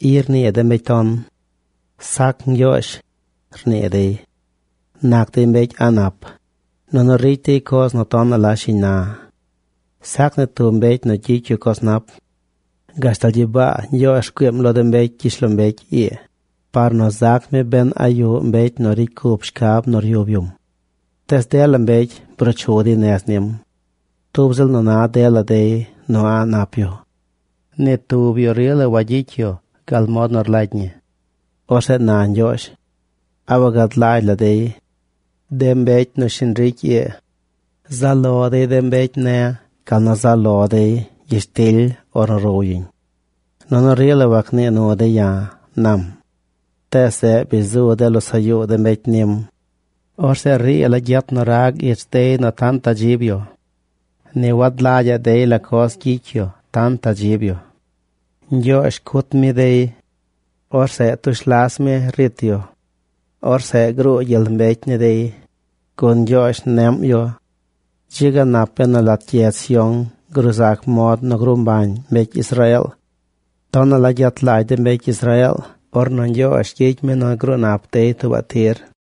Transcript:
I rnii de mbecy ton: “Sac Ñgyoozh”, rnii dey. Nac dey mbecy a̱ꞌ nap, nunu ricy dey coz nu tonaꞌ la shiñ na. Sac ni tub mbecy nu gyicy yu coz nap. Gashtal gyibaa Ñgyoozh rgüiim lo de mbecy gyishlombecy ii, par nu zac mi ben a yuꞌ mbecy nu ricy cup shcab nu ryub yum. Tees dela mbecy bruu chu dey nez nim. Tub ziꞌl nu na dela dey nu a̱ꞌ nap yu. Ni tub yu rila wagyicy yu gal mod nu rlagy ñi. Orzeꞌ na Ñgyoozh: “¿A wagad lagy la dey?, de mbecy nu shiñ ricy ii. Zaꞌ lo dey de mbecy ne̱ gal nu zaꞌ lo dey gyishtily ornu row yuñ. Nunu rila wagnii nu dey ya̱”, nam. Tees zeꞌ bi zu de losaꞌ yuu de mbecy nim. Orzeꞌ rii la gyet nu rag ich dey nu tantaꞌ rdzib yu. Ni wagad lagyaꞌ dey la coz gyicy yu tantaꞌ rdzib yu. Ñgyoozh cut mi dey. Orzeꞌ tush las mi rit yu. Orzeꞌ gruu gyel mbecy ni dey, gun Ñgyoozh neꞌm yu. ¡Dzi ga nap benu lat gyedz Sión gruu zac mod nu gruu mbañ mbecy Israeel! Tonaꞌ la gyet lagy de mbecy Israeel ornu Ñgyoozh gyicy mi nu gruu nap dey tuubaꞌ tir.